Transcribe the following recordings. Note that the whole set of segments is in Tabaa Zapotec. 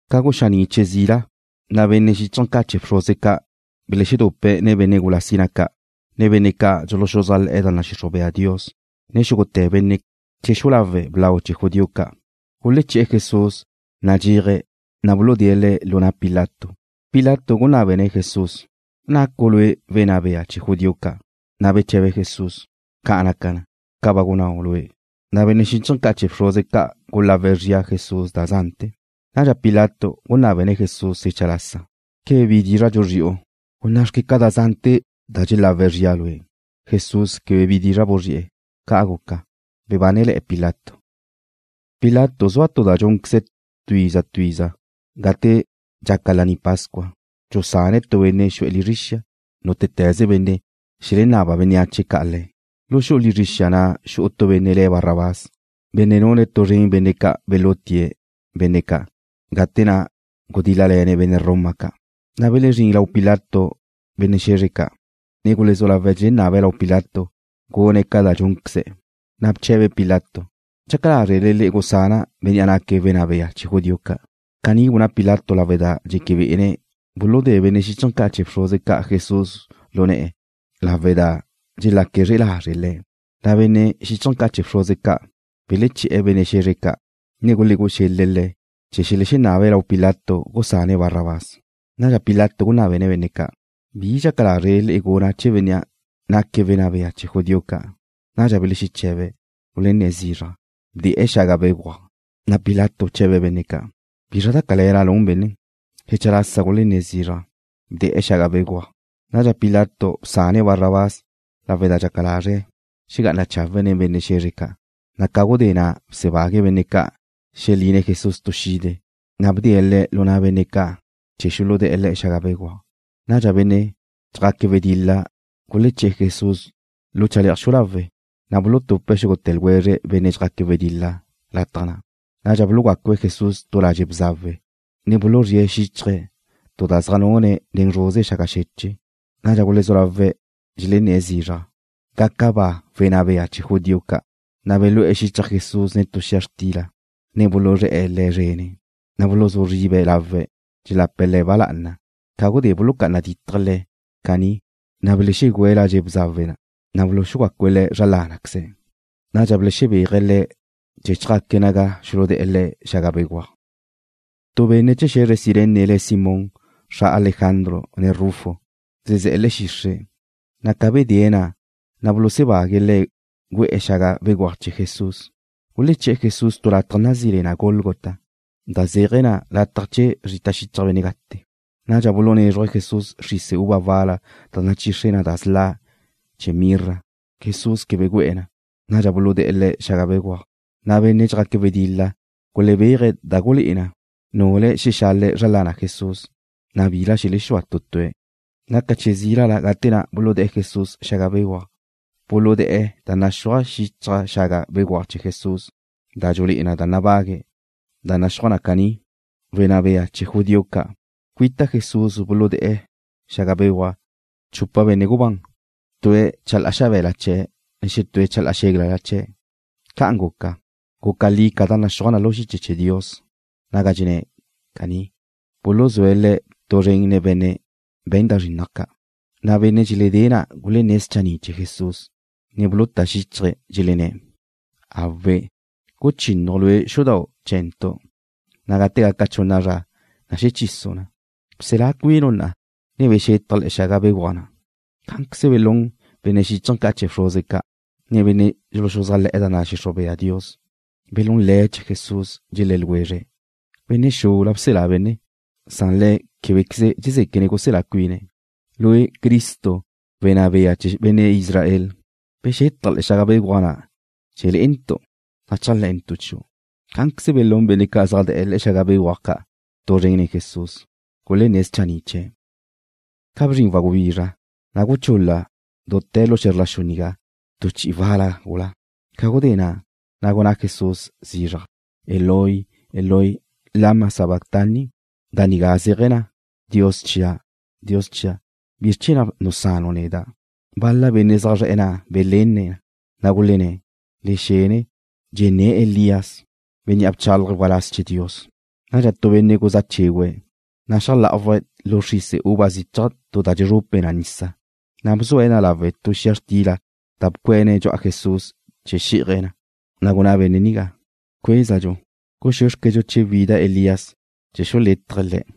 Ca guxaní' che zila, na' benne' xíchaje̱ ca' chee̱ bxruze ca' belexedupe̱' nen benne' gula sina ca', ne benne' ca' dxuluxuzájle̱'e̱ da nadxixruj bea Dios, ne xúgute̱ benne' chee̱ xu'u lawe' blau chee̱ judío ca'. Guleché̱'e̱ Jesús nadxéaje̱', na' buludée̱' Le̱' lu na' Pilato. Pilato gunábene̱' Jesús: ―¿Nacu' Lue' wenná bea chee̱ judío ca'? Na' beche̱be Jesús: ―Ca' naca na, ca ba gunnáu' lue'. Na' benne' xíchaje̱ ca' chee̱ bxruze ca' gulawe̱' zria Jesús da zante̱. Nadxa Pilato gunábene̱' Jesús xecha lasa: ―¿Quebe bi dizra' dxuzri'u? Gunná'xque ca da zánete̱ da dxelawe̱' zria Lue'. Jesús quebe bi dizra' ca buzri'e̱. Ca' guca, bebánele̱'e̱ Pilato. Pilato zua tu da dxúnqueze̱' tu iza tu iza gate dxaca Laní Pascua. Dxusane̱' tu benne' xu'e̱ lizre xia, nútete̱ze benne' xelenaba bénneache ca' le̱'. Lu xu'u lizre xia na' xu'u tu benne' le̱' Barrabás, benne' nune̱' tu zren benne' ca' belutie̱' benne' ca', gate na' gudíl-lale̱ne̱' benne' Roma ca'. Na' belezrín lau Pilato benne' xe̱zre ca', ne gulezú lawe̱' dxelenabe̱' lau Pilato gune̱' ca dxúnqueze̱'. Na' beche̱be Pilato: ―¿Dxaca lázrele le'e gusana' bénnea' naque̱' wenná bea chee̱ judío ca'? Caní gunná Pilato lawe' da dxeque be'ene̱' buludée̱' benne' xíchaje̱ ca' chee̱ bxruze ca' Jesús lu ne̱'e̱ lawe' da dxelaque̱' zre'e lazre' Le̱'. Na' benne' xíchaje̱ ca' chee̱ bxruze ca' beleché̱'e̱ benne' xe̱zre ca', ne gulegú'u xel-le̱' le̱' chee̱ xelexenabe̱' lau Pilato gusane̱' Barrabás. Nadxa Pilato gunábene̱' benne' ca': ―¿Bi dxaca lázrele le'e guna' chee̱ bénnea' naque̱' wenná bea chee̱ judío ca'? Nadxa belexeche̱be̱', gulenné̱' zizraj: ―Bde̱'e̱ xaga béguaj. Na' Pilato bche̱be̱' benne' ca': ―¿Bizra da cale̱la nun benne? Xecha lasa gulenné̱' zizraj: ―Bde̱'e̱ xaga béguaj. Nadxa Pilato bsane̱' Barrabás lawe' da dxaca lazre̱' xegá'ane̱' chawe' nen benne' xe̱zre ca'. Na' ca gudé na' bsebague̱' benne' ca' xeline̱' Jesús tu xide, na' bdee̱' Le̱' lu na' benne' ca' chee̱ xuludé̱'e̱ Le̱' xaga béguaj. Nadxa benne' dxjaque̱' wedil-la guleché̱'e̱ Jesús lu chale'aj xu'u lawe', na' bulutupe̱' xúgute̱ ljwezre' benne' dxjaque̱' wedil-la lataj na'. Na' bulugácue̱' Jesús tu ladxe' bzawe, ne buluzríe̱' xíchaje̱' tu da zaj nune̱' nen zruze xaga xeche'. Nadxa gulezú lawe̱' dxelenné̱' zizraj: ―¡Gaca ba wenná bea chee̱ judío ca'! Na' belú'e̱ xichaj Jesús nen tu xia xtila, ne buluzré̱'e̱ Le̱' zrene̱'. Na' buluzú zribe̱' lawe̱', dxelape̱' Le̱' ba lá'ana. Ca gudé bulucá'ana dítaje̱' Le̱' caní, na' belexegu'e̱ ladxe' bzawe, na' buluxugácue̱' Le̱' zra lá'anaqueze̱'. Nadxa belexebéaje̱' Le̱' chee̱ chjaque̱' naga xuludé̱'e̱ Le̱' xaga béguaj. Tu benne' chee̱ xe̱zre Cirene le̱' Simón, xra Alejandro, ne Rufo, zezé̱'e̱ le̱'e̱ xixre', na' ca bedée̱' na', na' bulusebague̱' le̱' gu'e̱ xaga béguaj chee̱ Jesús. Guleché̱'e̱ Jesús tu lataj nazí le na Gólgota, da zéaje̱ na “Lataj Chee̱ Zrita Xichaj Benne' Gate.” Nadxa bulunézruje̱' Jesús xrise uva wal-la da nachixre da sla' chee̱ mirra. Jesús quebe gu'e̱ na. Nadxa buludé̱'e̱ Le̱' xaga béguaj, na' benne' dxjaque̱' wedil-la gulebéaje̱' da gulé'e na nule̱' xelexale̱' zra lana Jesús, na' bila xelexúa tu tue̱'. Guca che zílala gate na' buludé̱'e̱ Jesús xaga béguaj. Buludé̱'e̱ da naxúaj xichaj xaga béguaj chee̱ Jesús da dxulé'e na da nabague̱', da naxúaj na caní: “Wenná Bea Chee̱ Judío Ca'.” Cuita Jesús buludé̱'e̱ le̱'e xaga béguaj ca' chupa benne' gubán, tue̱' chalá'a xabe̱la chee̱', ne xetúe̱' chalá'a xéglala chee̱'. Ca'an guca, guca li ca da naxúaj na lu xiche chee̱ Dios naga dxenné̱' caní: “Buluzue̱' Le̱' tu zren nen benne' we̱n da zrinnaj ca'.” Na' benne' dxeledée̱' na' gulenné̱' schanni' chee̱ Jesús, ne buluté̱' xíchaje̱', dxelenné̱': ―Awe'. Guchínnaju' Lue' xudau' chee̱ntu', na' gate gaca chunna zra, na' xechisu' na. Bselá cuinu' na'a, ne bexetaj le̱'e xaga béguaj na'. Cá'anqueze belún benne' xíchaje̱ ca' chee̱ bxruze ca', ne benne' dxuluxuzájle̱'e̱ da nadxixruj bea Dios. Belún le̱' chee̱ Jesús, dxelé̱' ljwezre̱': ―Benne' xula bselá benne, san Le̱' québequeze dxezéquene̱' guselá cuine̱'. Lue', Cristo, wenná bea chee̱ benne' Israel, bexetaj le̱'e̱ xaga béguaj na' chee̱ le'entu', na' chéajle̱ntu' chiu'. Cá'anqueze belún benne' ca' zaj de̱'e̱ le̱'e xaga béguaj ca' tu zren nen Jesús, gulenné̱' schanni' chee̱'. Ca bzrin wagubizra, na' guchul-la dute̱ lu xe̱zr la xu nigá tu chi'i wal-la gula. Ca gudé na', na' gunná Jesús zizraj: ―Eloi, Eloi, ¿lama sabactani? Da nigá zéaje̱ na: “Dios chia', Dios chia', ¿bizr chee̱ na' nusanu' neda'?” Bal-la benne' ca' zaj zre̱'e̱ na' belenne̱' na, na' gulenné̱': ―Le xene. Dxenné̱' Elías, bénnea' bchálaje̱' waláz chee̱ Dios. Nadxa tu benne' guzá chégüe̱', na' xeajlá'awaje̱' lu xrise uva zichaj tu da dxezrupe na nisa, na' bzue̱' na lawe' tu xia xtila da bcuene̱' dxu'a Jesús chee̱ xi'aje̱', na' gunná benne' nigá: ―Cuézadxu. Guxúexquedxu che wida Elías chee̱ xulétaje̱' Le̱'.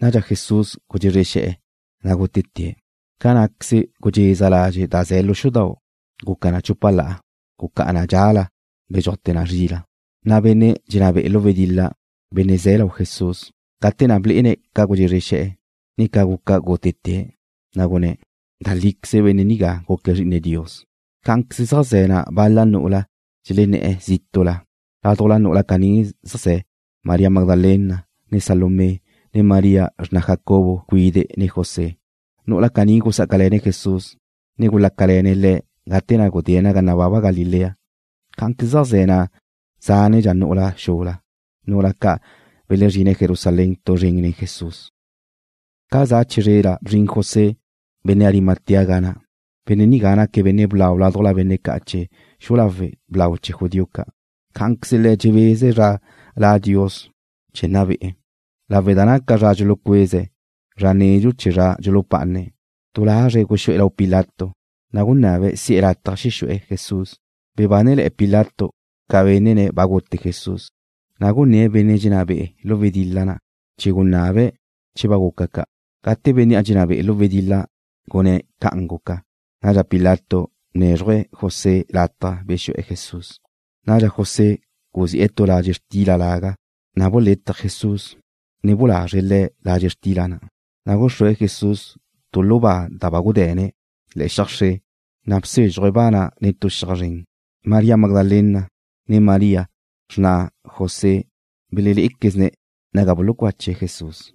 Nadxa Jesús gudxezre xe̱'e̱, na' gútete̱'. Ca ná'queze gudxeza ladxe' da ze̱ lu xudau', guca na chúpala. Gucá'a na dxa'la, bedxúajte̱ na zri'la. Na' benne' dxenná be'e̱ lu wedil-la, benne' ze̱' lau Jesús, gate na' blé'ene̱' ca gudxezre xe̱'e̱, ne ca guca gútete̱', na' gunné̱': ―Da líqueze benne' nigá guque̱' Zri'ine Dios. Cá'anqueze zaj ze̱ na' bal-la nu'ula dxelenné̱'e̱ zítu'la. Ládujla nu'ula caní zaj ze̱ María Magdalena, ne Salomé, ne María, xrna Jacobo cuide' ne José. Nu'ula caní gusá'acale̱ne̱' Jesús, ne gulácale̱ne̱' Le̱' gate na' gudé̱' naga nababa Galilea. Cá'anqueze zaj ze̱ na' zánedxa nu'ula xula, nu'ula ca' belezrine̱' Jerusalén tu zren nen Jesús. Ca za chizrela bzrin José, benne' Arimatea ga na'. Benne' nigá naque̱' benne' blau ládujla benne' ca' chee̱ xu'u lawe' blau chee̱ judío ca'. Cá'anqueze le̱' dxebeze̱' zra la' Dios chee̱ nna be'e̱. Lawe' da naca zra dxulucueze̱', zra nedxu chee̱ zra dxulupá'ane̱', du lazre̱' guxú'e̱ lau Pilato, na' gunabe̱' si'e̱ lataj xexu'e̱ Jesús. Bebánele̱'e̱ Pilato ca bénnene̱' ba gute Jesús, na' gunné̱' benne' dxenná be'e̱ lu wedil-la na' chee̱ gunabe̱' che ba guca ca'. Gate bénnea' dxenná be'e̱ lu wedil-la gunné̱' ca'an guca, nadxa Pilato bnézruje̱' José lataj bexu'e̱ Jesús. Nadxa José guzi'e̱ tu ladxe' xtila laga, na' bulétaje̱' Jesús, ne bulazre̱' Le̱' ladxe' xtila na'. Na' gúxrue̱' Jesús tu lu ba da ba gude̱ne̱' le̱'e̱ xiaj xre, na' bsézxuje̱' ba na' nen tu xiaj zren. María Magdalena, ne María, xrna José belelé'equezne̱' naga bulucache̱' Jesús.